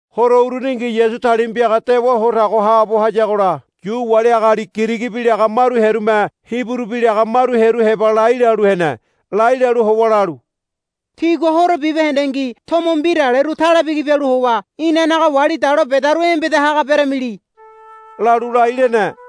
Horo uruningi Yasu talima piaga dewa ho tago haabo hayagola Yu wali agali Girigi bi laga maru hearume Hiburu bi laga maru hearu heba lai lalu hene. Lai lalu howa lalu, Tígua horo bibahendengi tomo mbiraleru tale bigi bialu howa inanaga wali dalo bedaru embeda haga beramili, lalu lai lene.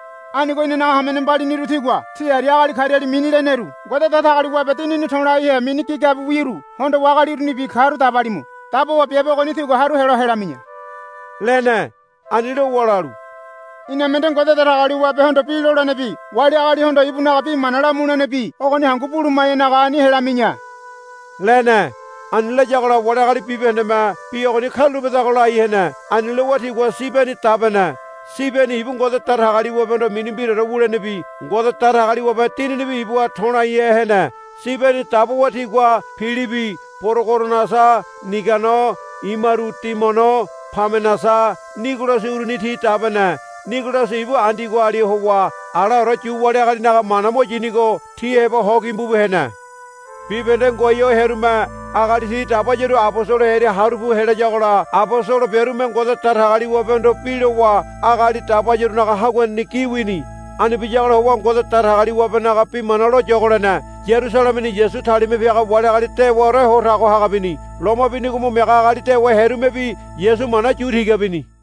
Anigo inanaga hamene mbaliniru tígua tí aria agali kariali mini leneru Ngode Datagaliwabe Dinini to̱laihe mini gigabiwiru hondowa agali urunibi karu dabalimu. Dabowa biabe ogoni tigua haru helo helami̱ya, lene. Ani lowa lalu, Iname nde Ngode Datagaliwabehondo bi lolenebi wali agalihondo ibunaga bi mana lamulenebi ogoni hangu buluma̱yanaga ani helami̱ya, lene. Ani layagola wali agali bibahendeme, Bi ogoni karulapedago, lai hene. Ani lowa tigua Sibeni dabene. Sibeni ibu Ngode Datagaliwabehondo mini mbiraore wulenebi Ngode Datagaliwabe Dininibi ibuha to̱laihe hene. Sibeni dabowa tigua Pilibi Porogorasa Nigano imaru Timono Pamenasa Nigolasi uruni ti dabene. Nigolasi ibu Andiogoali howa alaore Yu wali agalinaga mana mo yinigo ti heba ho gimbu bu hene. Bibahende ngoai ho hearume agali ti dabayaru abosolo hearia haru pu helayagola abosolo biarume Ngode Datagaliwabehondo bi lowa agali dabayarunaga haguaneni gi wini. Ani biyagola howa Ngode Datagaliwabenaga bi mana loyogo lene. Yarusalemeni Yasu talima piaga wali agali dewaore ho tago haga bini. Loma binigo mo miaga agali dewa hearumebi Yasu mana yu tiga bini.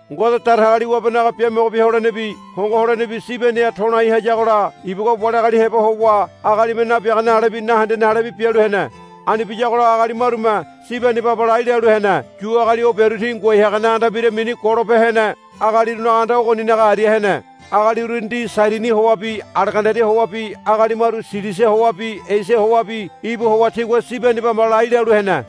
Ngode Datagaliwabenaga biamogo bia holenebi hongo holenebi Sibeniha to̱lai hayagola ibugua wali agali heba howa agalime nabiagane alebi nahendene alebi bialu hene. Ani biyagola agali marume Sibeni baba lai lalu hene. Yu agali o biaru ti ngoai hagane anda mbira mini Golope Hene Agalirunaga Anda ogoninaga aria hene. Agali uruni ti Sairini howabi Alegandaria howabi agali maru Silisia howabi Esia howabi íbu howa tigua Sibeni baba lai lalu hene.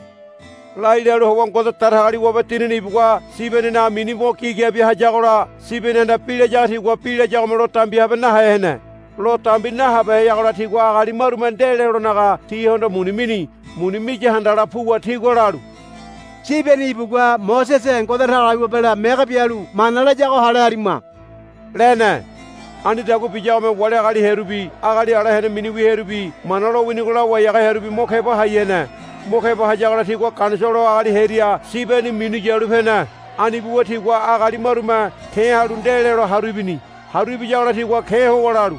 Lai lalu howa Ngode Datagaliwabe Dinini ibugua Sibeninaga mini mo gigabia hayagola Sibenihanda bi layago tigua bi layagome lo dambi nahabehe hene. Lo dambi nahabeheyagola tigua agali marume nde lelonaga tihondo muni mini. Muni miya handala puwa tigua lalu, Sibeni ibugua Mosese Ngode Datagaliwabela mege bialu mana layago hale harima, lene. Anidagua biyagome wali agali hearubi agali ala hene miniwi hearubi Mana lowinigo lawai haga hearubi mo keba hai hene. Mo keba hayagola tigua Ganisolo agali hearia Sibeni minu yalu pene. Ani buwa tigua agali marume ke̱ halu nde lelo haru ibini. Haru ibiyagola tigua ke̱ howa lalu,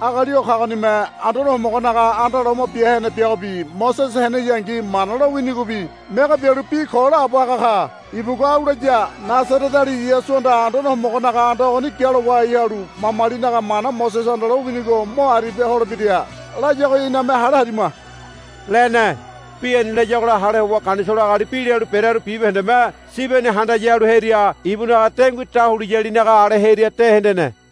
Agali o kagonime Anduane Homogonaga anda loma bia hene biagobi Mosese heneyangi Mana lowinigobi mege bialu bi ko laabo haga ka. Ibugua au laya, Nasareteali Yasuhanda Anduane Homogonaga anda ogoni gialo wahai halu mamalinaga mana Mosesehanda lowinigo mo aribia holebira, layago iname hale harima, lene. Bi ani layagola hale howa Ganisolo agali bi lalu berearu bibahendeme Sibeni handaya halu hearia ibunaga dengui dahuliyalinaga ale hearia de hendene.